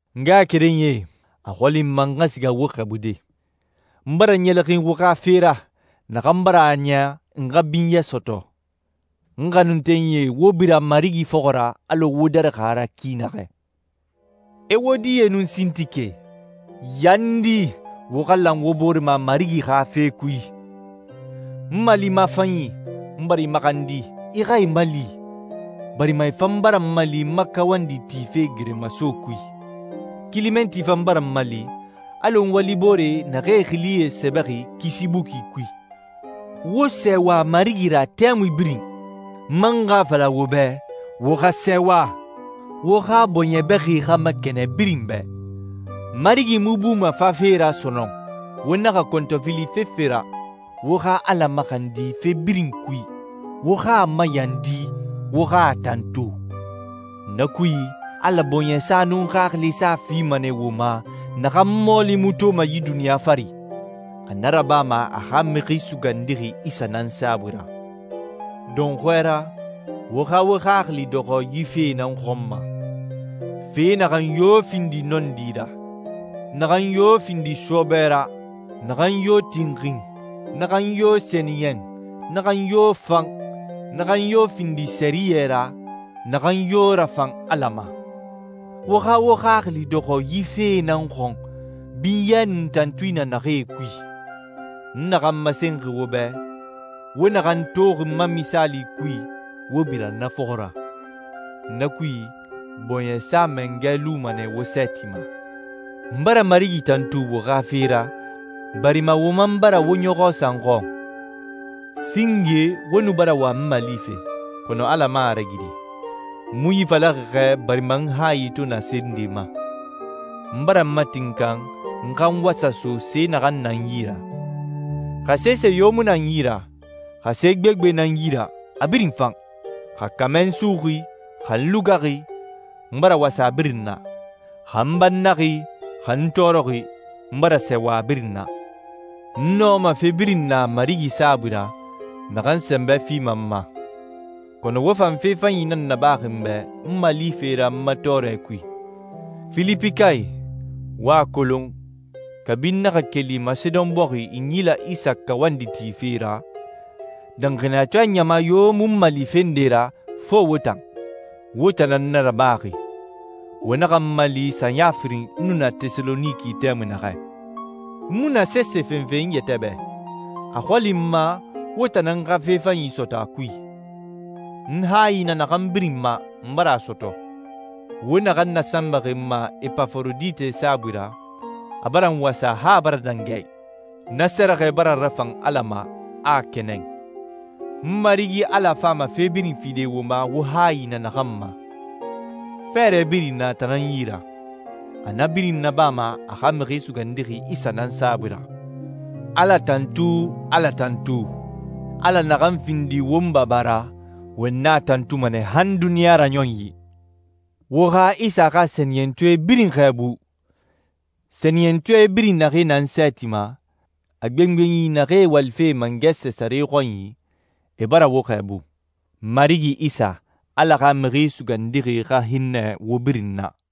N ngaxakerenyie, a xɔli n ma n xa siga wo xɛɛbude. N bara ɲɛlɛxin wo xa fe ra, naxan bara a niya n xa binyɛ sɔtɔ. N xanuntenyie, wo bira Marigi fɔxɔ ra alɔ wo darixi a ra ki naxɛ. Ewodiye nun Sintike, yandi wo xa lan wo bore ma Marigi xa fe kui. N malima fanyi, n bara i maxandi, i xa e mali, barima e fan bara n mali n ma kawandi tife geremaso kui. Kilementi fan bara n mali, alɔ n walibooree naxee xilie sɛbɛxi kisi buki kui. Wo sɛɛwa Marigi ra tɛmui birin. N man xa a fala wo bɛ, wo xa sɛɛwa. Wo xa bɔɲɛ bɛxi xa makɛnɛn birin bɛ. Marigi mu buma fafe ra sɔnɔn. Wo naxa kɔntɔfili fefe ra, wo xa Ala maxandi fe birin kui, wo xa a mayandi, wo xa a tantu. Na kui, Ala bɔɲɛsa nun xaxilisa fima nɛ wo ma naxan mɔɔli mu toma yi duniɲa fari. A na rabama a xa Mixi Sugandixi Isa nan saabui ra. Dɔnxɔɛ ra, wo xa wo xaxili dɔxɔ yi fee nan xɔn ma: fe naxan yo findi nɔndi ra, naxan yo findi sɔɔbɛ ra, naxan yo tinxin, naxan yo sɛniyɛn, naxan yo fan, naxan yo findi sɛriyɛ ra, naxan yo rafan Ala ma. Wo xa wo xaxili dɔxɔ yi fee nan xɔn binyɛ nun tantui na naxee kui. N naxan masenxi wo bɛ, wo naxan toxi n ma misaali kui, wo bira na fɔxɔ ra. Na kui, Bɔɲɛsa Mangɛ luma nɛ wo sɛɛti ma. N bara Marigi tantu wo xa fe ra barima wo man bara wo ɲɔxɔ sa n xɔn. Singe wo nu bara wa n malife, kɔnɔ Ala mu a ragiri. N mu yi falaxi xɛ barima n hayi to na se nde ma. N bara n matinkan n xa wasa so se naxan na n yi ra. Xa sese yo mu na n yi ra, xa se gbegbe na n yi ra, a birin fan. Xa kaamɛ n suxuxi, xa n lugaxi, n bara wasa a birin na. Xa n bannaxi, xa n tɔɔrɔxi, n bara sɛɛwa a birin na. N nɔma fe birin na n Marigi saabui ra, naxan sɛnbɛ fima n ma. Kɔnɔ wo fan fe fanyi nan nabaxi n bɛ n malife ra n ma tɔɔrɛ kui. Filipikae, wo a kolon, kabi n naxa keli Masedon bɔxi Inyila Isa kawandi tife ra, danxaniyatɔɛ ɲama yo mu n mali fe nde ra fo wo tan. Wo tan nan na rabaxi. Wo naxa n mali sanya firin n nu na Tɛsaloniki tɛmui naxɛ. N mu na sese fenfe n yɛtɛ bɛ. A xɔli n ma wo tan nan xa fe fanyi sɔtɔ a kui. N hayi na naxan birin ma, n bara a sɔtɔ. Wo naxan nasanbaxi n ma Epaforodite saabui ra, a bara n wasa han a bara dangi a i. Na sɛrɛxɛ bara rafan Ala ma, a a kɛnɛn. N Marigi Ala fama fe birin fide wo ma wo hayi na naxan ma. Fɛɛrɛ birin na a tan nan yi ra, a na birin nabama a xa Mixi Sugandixi Isa nan saabui ra. Ala tantu, Ala tantu. Ala naxan findi won Baba ra, won a tantuma nɛ han duniɲa raɲɔnyi. Wo xa Isa xa sɛniyɛntɔɛ birin xɛɛbu. Sɛniyɛntɔɛ birin naxee na n sɛɛti ma, a gbengbenyi naxee walife Mangɛ Sesare xɔnyi, e bara wo xɛɛbu. Marigi Isa, Ala xa Mixi Sugandixi, xa hinnɛ wo birin na.